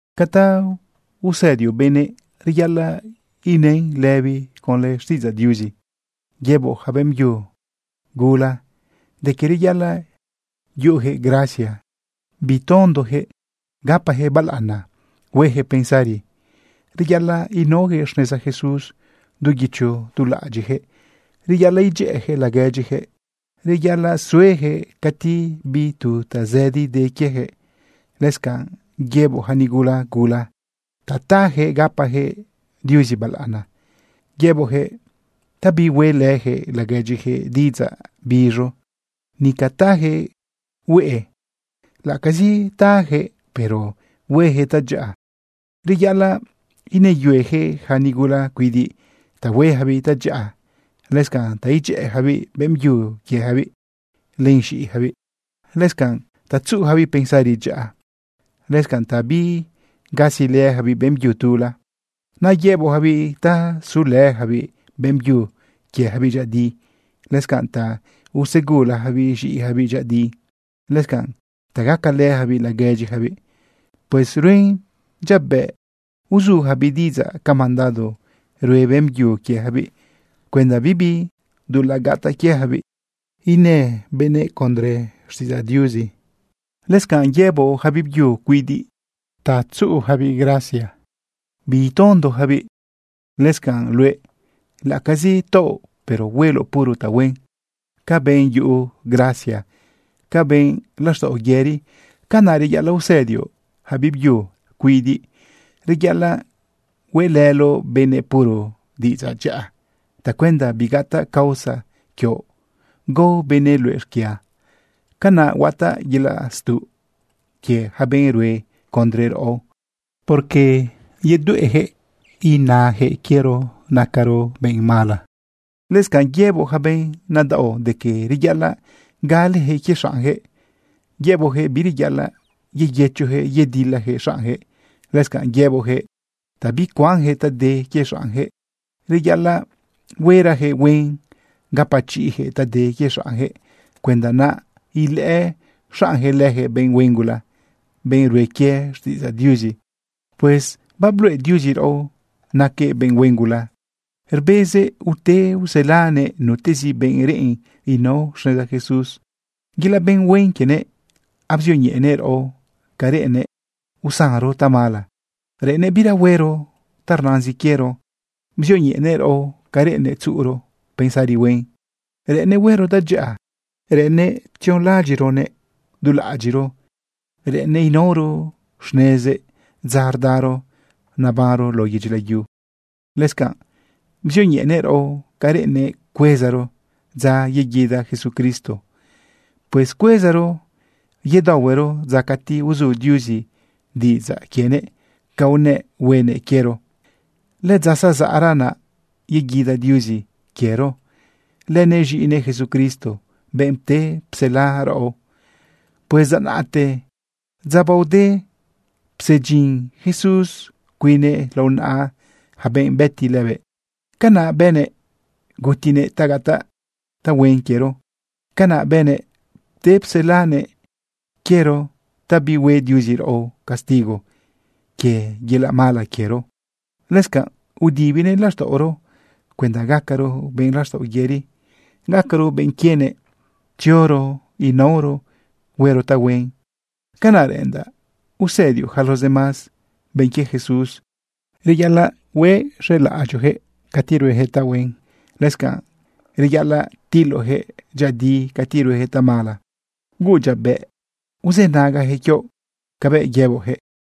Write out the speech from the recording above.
Ca ta usëdioꞌ benëꞌ reyaꞌalaꞌ inën lëbizi conlë xtiꞌidzaꞌ Diuzi. Yëboꞌ yaca beꞌmbyu gula de que reyaꞌalaꞌ yuꞌuyaquëꞌ gracia, bitondoyaquëꞌ, gapajëꞌ balaꞌana, huejëꞌ pensari. Reyaꞌalaꞌ inaojëꞌ xneza Jesús du guicho du laꞌadyiꞌyaquëꞌ. Reyaꞌalaꞌ idyëꞌëyaquëꞌ laguedyiyaquëꞌ. Reyaꞌalaꞌ sueyaquëꞌ cati bi tu tazëdi de quieyaquëꞌ. Lëscanꞌ yëboꞌ yaca nigula gula ta tayaquëꞌ gapajëꞌ Diuzi balaꞌana. Yëboꞌjëꞌ ta bihueꞌlëyaquëꞌ laguedyiyaquëꞌ diꞌidzaꞌ biz̃u, nica tayaquëꞌ hueꞌe. Laꞌacazi tajëꞌ, pero huejëꞌ tadyaꞌa. Reyaꞌalaꞌ inëyueyaquëꞌ ja nigula cuidiꞌ ta hueyacabiꞌ tadyaꞌa, lëscanꞌ ta idyëꞌëyacabiꞌ beꞌmbyu quieyacabiꞌ len z̃iꞌiyacabiꞌ, lëscanꞌ ta tzuꞌuyacabiꞌ pensari dyaꞌa, lëscanꞌ ta bigasilëyacabiꞌ beꞌmbyu tula. Naꞌ yëboꞌyacabiꞌ ta sulëyacabiꞌ beꞌmbyu quieyacabiꞌ dyëꞌëdi, lëscanꞌ ta usegulayacabiꞌ z̃iꞌiyacabiꞌ dyëꞌëdi, lëscanꞌ ta gacalëyacabiꞌ laguedyiyacabiꞌ. Pues ruen dyabëꞌ uzuyacabiꞌ diꞌidzaꞌ ca mandado rue beꞌmbyu quieyacabiꞌ cuenda bibi dulaꞌ gataꞌ quieyacabiꞌ ina benëꞌ condre xtiꞌidzaꞌ Diuzi. Lëscanꞌ yëboꞌ yaca biꞌbyu cuidiꞌ ta yuꞌuyacabiꞌ gracia bitondoyacabiꞌ. Lëscanꞌ, luëꞌ, laꞌacazi taoꞌ, pero hueloꞌ puro tahuen. Ca benꞌ yuꞌu gracia, ca benꞌ laxtaꞌo yëri, canaꞌ reyaꞌalaꞌ usëdioꞌ yaca biꞌbyu cuidiꞌ. Reyaꞌalaꞌ hueꞌlëloꞌ benëꞌ puro diꞌidzaꞌ dyaꞌa tacuenda bigataꞌ causa quioꞌ gao benëꞌ luëꞌ xquia. Canaꞌ huataꞌ yelaꞌ stuꞌ quie yaca benꞌ rue condre raꞌo, porque yedueꞌyaquëꞌ inajëꞌ quiero nacaro benꞌ mala. Lëscanꞌ yëboꞌ yaca benꞌ nadaꞌo de que reyaꞌalaꞌ galejëꞌ quie xaꞌnjëꞌ. Yëboꞌjëꞌ bireyaꞌalaꞌ yeyëchojëꞌ yedilalëjëꞌ xaꞌnjëꞌ. Lëscanꞌ yëboꞌjëꞌ ta bicuanyaquëꞌ ta de quie xaꞌnyaquëꞌ. Reyaꞌalaꞌ huerajëꞌ huen gapachiꞌjëꞌ ta de quie xaꞌnjëꞌ cuenda naꞌ ilëꞌë xaꞌnyaquëꞌ leyaquëꞌ benꞌ huen gula, benꞌ rue quie xtiꞌidzaꞌ Diuzi. Pues babluꞌe Diuzi raꞌo naquëꞌ benꞌ huen gula, rbezëꞌ ute uselanëꞌ nutezi benꞌ reꞌen inao xneza Jesús. Yelaꞌ benꞌ huen quienëꞌ abzioñeꞌenëꞌ raꞌo ca reꞌennëꞌ usanro tamala, reꞌennëꞌ bira huero ta rnazin quiero. Bzioñeꞌenëꞌ raꞌo ca reꞌennëꞌ tzuꞌuro pensari huen, reꞌennëꞌ huero tadyaꞌa, reꞌennëꞌ tzionlaꞌadyiꞌronëꞌ dulaꞌadyiꞌro, reꞌennëꞌ inaoro xnezëꞌ dza rdaro nabanro lao yedyi layu. Lëscanꞌ bzioñeꞌenëꞌ raꞌo ca reꞌennëꞌ cuezaro dza yeguida Jesucristo. Pues cuezaro yedaohuero dza cati uzu Diuzi diꞌidzaꞌ quienëꞌ ca unëꞌ huenëꞌ quiero. Lëdza zazaꞌra naꞌ yeguida Diuzi quiero lënëꞌ z̃iꞌinëꞌ Jesucristo, benꞌ pte psela raꞌo. Pues dza naꞌte, dza baode, psedyin Jesús cuinnëꞌ lao naꞌa yaca benëꞌ bëti lëbëꞌ. Canaꞌ bënëꞌ gutinëꞌ ta gataꞌ tahuen quiero. Canaꞌ bënëꞌ pte pselanëꞌ quiero ta bihue Diuzi raꞌo castigo quie yelaꞌ mala quiero. Lëscanꞌ udibinëꞌ laxtaꞌoro cuenda gacaro benꞌ laxtaꞌo yëri, gacaro benꞌ quienëꞌ, tzioro inaoro huero tahuen. Canaꞌ reꞌendaꞌ usëdioꞌ yaca los demás benꞌ quie Jesús. Reyaꞌalaꞌ uxelaꞌadyoꞌjëꞌ cati ruejëꞌ tahuen, lëscanꞌ reyaꞌalaꞌ tiloꞌjëꞌ dyëꞌëdi cati ruejëꞌ tamala. Huuꞌ dyabëꞌ uzënagajëꞌ quioꞌ cabëꞌ yëboꞌyaquëꞌ.